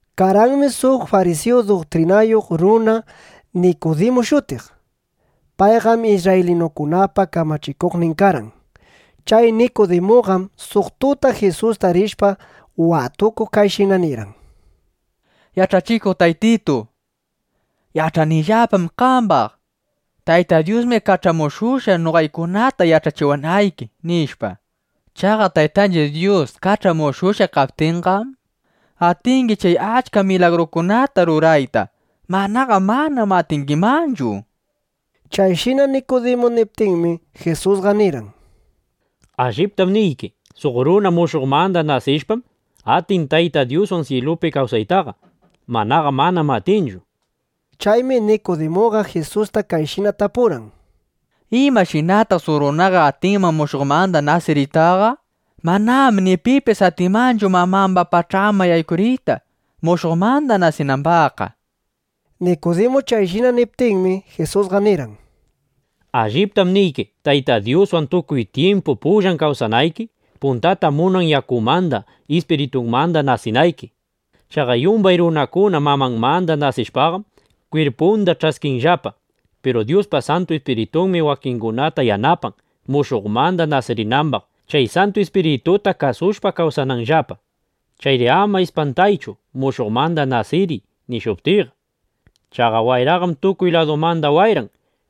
Karqanmi suq farisiyu duktrinayuq runa Nikudimu shutiq. Payqam isrraylinukunapa kamachikuqnin karqan. Chay Nikudimuqam suq tuta Jisusta rishpa watukuq, kayshina nirqan: —Yach'achikuq Taytitu, yach'anillapam qambaq: Tayta Dyusmi kach'amushushqa, noqaykunata yach'achiwanayki, nishpa. Chaqa Taytanchiq Dyus kach'amushushqa kaptinqam, atingi chay achka milagrukunata rurayta. Manaqa manam atingimanchu, nishpa. Chayshina Nikudimu niptinmi, Jisusqa nirqan: —Alliptam niyki, suq runa mushuqmanda nasishpam, atin Tayta Dyuswan syilupi kawsaytaqa. Manaqa manam atinchu, nishpa. Chaymi Nikudimuqa Jisusta kayshina tapurqan: —¿Imashinataq suq runaqa atinman mushuqmanda nasiriytaqa? Manam ni pipis atinmanchu mamamba pach'anman yaykuriyta, mushuqmanda nasinambaqqa, nishpa. Nikudimu chayshina niptinmi, Jisusqa nirqan: —Alliptam niyki, Tayta Dyuswan tukuy tyimpu pullan kawsanayki, puntata munan yakumanda, ispiritumanda nasinayki. Chaqa yumbay runakuna mamanmanda nasishpaqam, kwirpunda ch'askinllapa. Piru Dyuspa Santu Ispiritunmi wakingunata yanapan, mushuqmanda nasirinambaq, chay Santu Ispirituta kasushpa kawsananllapa. Chayri ama ispantaychu: “Mushuqmanda nasiriy”, nishuptiyqa. Chaqa wayraqam tukuy ladumanda wayran.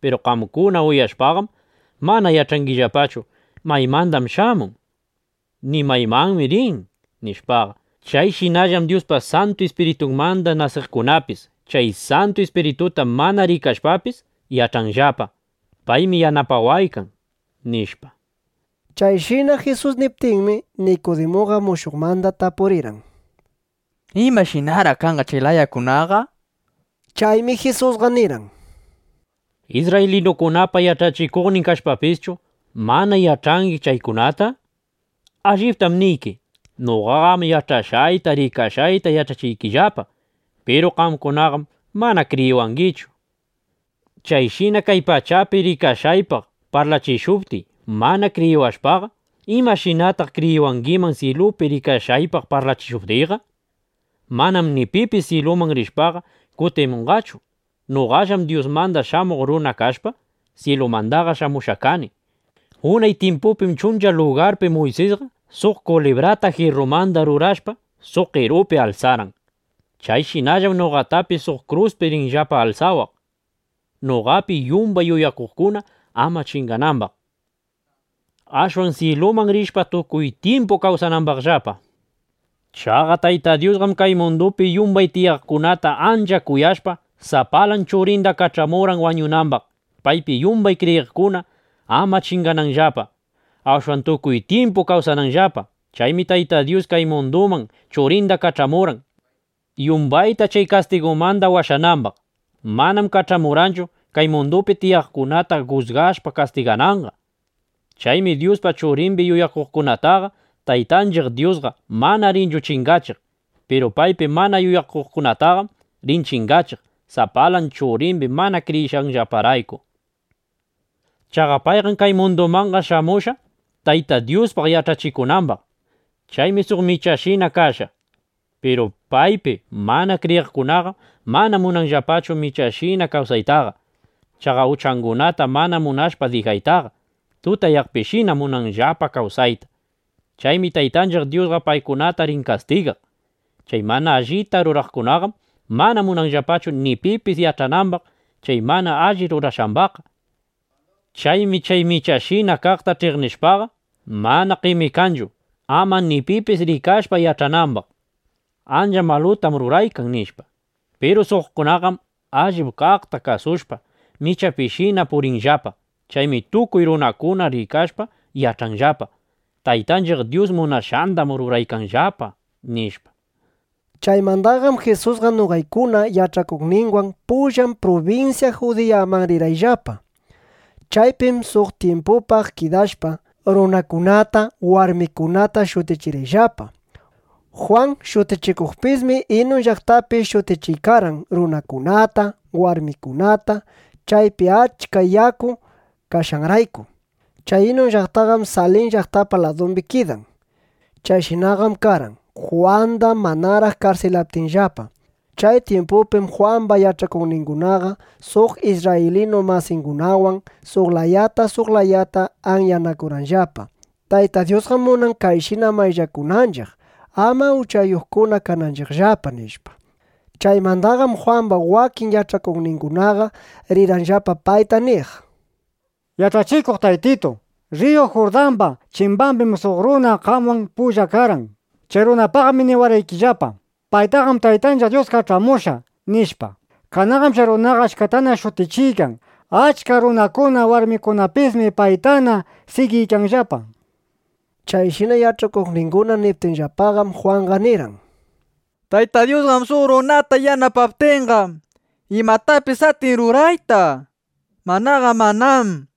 Piru qamkuna uyashpaqam, mana yach'angillapachu: ¿Maymandam shamun? ni ¿maymanmi rin? nishpaqa. Chayshinallam Dyuspa Santu Ispiritunmanda nasiqkunapis. (Chay Santu Ispirituta mana rikashpapis, yach'anllapa: Paymi yanapawaykan, nishpa.) Chayshina Jisus niptinmi, Nikudimuqa mushuqmanda tapurirqan: —¿Imashinaraq kanqa chay layakunaqa? nishpa. Chaymi Jisusqa nirqan: —Isrraylinukunapa yach'achikuqnin kashpapischu, ¿mana yach'angi chaykunata? Alliptam niyki, noqaqam yach'ashqayta, rikashqayta yach'achiykillapa. Piru qamkunaqam mana kriyiwangichu. Chayshina kay pachapi rikashqaypaq parlachishuptiy, mana kriyiwashpaqa, ¿imashinataq kriyiwangiman, syilupi rikashqaypaq parlachishuptiyqa? Manam ni pipis syiluman rishpaqa, kutimushqachu. Noqallam Dyusmanda Shamuq Runa kashpa, syilumandaqa shamushqa kani. Unay tyimpupim chuncha lugarpi Muysisqa suq kulibrata jirrumanda rurashpa, suq qerupi alsarqan. Chayshinallam noqatapis suq kruspi rinllapa alsawaq, noqapi yumbay yuyakuqkuna ama chinganambaq, ashwan syiluman rishpa, tukuy tyimpu kawsanambaqllapa, nishpa. Chaqa Tayta Dyusqam kay mundupi yumbay tiyaqkunata ancha kuyashpa, sapalan Churinda kach'amurqan wañunambaq, paypi yumbay kriyiqkuna ama chingananllapa; ashwan tukuy tyimpu kawsananllapa. Chaymi Tayta Dyus kay munduman Churinda kach'amurqan, yumbayta chay kastigumanda washanambaq. Manam kach'amurqanchu, kay mundupi tiyaqkunata jusgashpa kastigananqa. Chaymi Dyuspa Churimbi yuyakuqkunataqa Taytanchiq Dyusqa mana rinchu chingachiq. Piru paypi mana yuyakuqkunataqam rin chingachiq, sapalan Churimbi mana kriyishqanllaparayku. Chaqa payqam kay mundumanqa shamushqa, Tayta Dyuspaq yach'achikunambaq. Chaymi suq michashina kashqa. Piru paypi mana kriyiqkunaqam mana munanllapachu michapishina kawsaytaqa. Chaqa uchangunata mana munashpa dijaytaqa, tutayaqpishina munanllapa kawsayta. Chaymi Taytanchiq Dyusqa paykunata rin kastigaq. Chay mana allita ruraqkunaqam mana munanllapachu ni pipis yach'anambaq chay mana alli rurashqambaqqa. Chaymi chay michashina kaqta ch'iqnishpaqa, mana qemikanchu, ama ni pipis rikashpa yach'anambaq: “Ancha malutam ruraykan”, nishpa. Piru suqkunaqam allip kaqta kasushpa, michapishina purinllapa. Chaymi tukuy runakuna rikashpa yach'anllapa: Taytanchiq Dyus munashqandam ruraykanllapa, nishpa. Chaymandaqam Jisusqa noqaykuna yach'akuqninwan pullan prubinsya Judiyaman rirqayllapa. Chaypim suq tyimpupaq kidashpa, runakunata, warmikunata shutichirqayllapa. Jwan Shutichikuqpismi Inun llaqtapi shutichiykarqan runakunata, warmikunata, chaypi achka yaku kashqanrayku. Chay Inun llaqtaqam Salim llaqtapa ladumbi kidan. Chayshinaqam karqan, Jwanda manaraq karsilaptinllapa. Chay tyimpupim Jwamba yach'akuqningunaqa suq isrraylinu masingunawan suq layata suq layata anyanakurqanllapa: —Tayta Dyusqam munan kayshina mayllakunanchiq, ama uchayuqkuna kananchiqllapa, nishpa. Chaymandaqam Jwamba wakin yach'akuqningunaqa rirqanllapa payta niq: —Yach'achikuq Taytitu, rriyu Jurdamba chimbambim suq runa qamwan pulla karqan. Chay runapaqmi niwarqaykillapa: “Paytaqam Taytanchiq Dyus kach'amushqa”, nishpa. Kananqam chay runaqa achkatana shutichiykan. Achka runakuna, warmikunapismi paytana sigiykanllapa, nishpa. Chayshina yach'akuqninguna niptinllapaqam, Jwanqa nirqan: —Tayta Dyus suq runata yanapaptinqam, imatapis atin rurayta. Manaqa manám.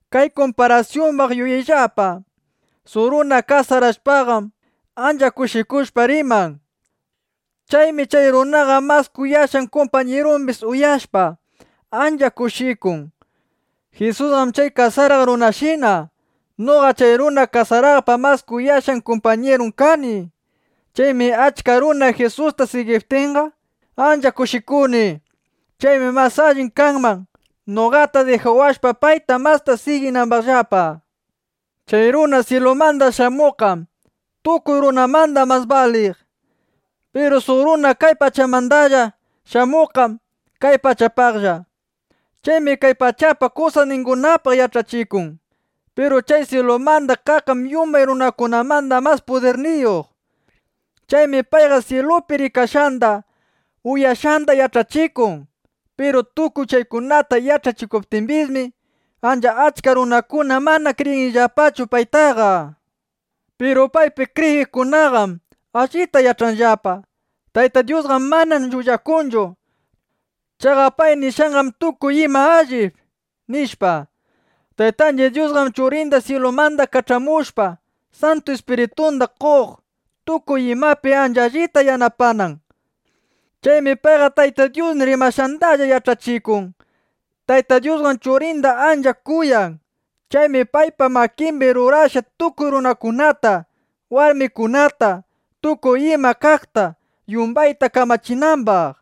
Kay kumparasyumbaq yuyayllapa: Suq runa kasarashpaqam, ancha kushikushpa riman. Chaymi chay runapa mas kuyashqan kumpañirumbis uyashpa, ancha kushikun. Jisusqam chay kasaraq runashina. Noqa chay runa kasaraqpa mas kuyashqan kumpañirun kani. Chaymi achka runa Jisusta sigiptinqa, ancha kushikuni. Chaymi mas alli kanman, noqata dijawashpa, paytana masta siginambaqllapa. Chay runa syilumanda shamuqqam tukuy runakunamanda mas baliq. Piru suq runa kay pachamandalla shamuqqam kay pachapalla. Chaymi kay pachapa kusasningunapaq yach'achikun. Piru chay syilumanda kaqqam yumbay runakunamanda mas pudirniyuq. Chaymi payqa syilupi rikashqanda, uyashqanda yach'achikun. Piru tukuy chaykunata yach'achiptimbismi, ancha achka runakuna mana kriyinllapachu paytaqa. Piru paypi kriyiqkunaqam allita yach'anllapa: Tayta Dyusqam mana llullakunchu. Chaqa pay nishqanqam tukuy ima allip, nishpa. Taytanchiq Dyusqam Churinda syilumanda kach'amushpa, Santu Ispiritunda qon, tukuy imapi ancha allita yanapanan. Chaymi payqa Tayta Dyus rimashqandalla yach'achikun. Tayta Dyusqam Churinda ancha kuyan. Chaymi paypa makimbi rurashqa tukuy runakunata, warmikunata, tukuy ima kaqta, yumbayta kamachinambaq.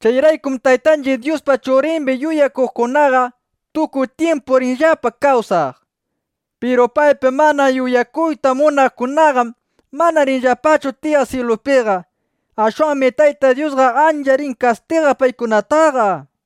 Chayraykum Taytanchiq Dyuspa Churimbi yuyakuqkunaqa tukuy tyimpu rinllapa kawsaq. Piru paypi mana yuyakuyta munaqkunaqam mana rinllapachu tiyaq syilupiqa. Ashwanmi Tayta Dyusqa ancha rin kastigaq paykunataqa, nishpa.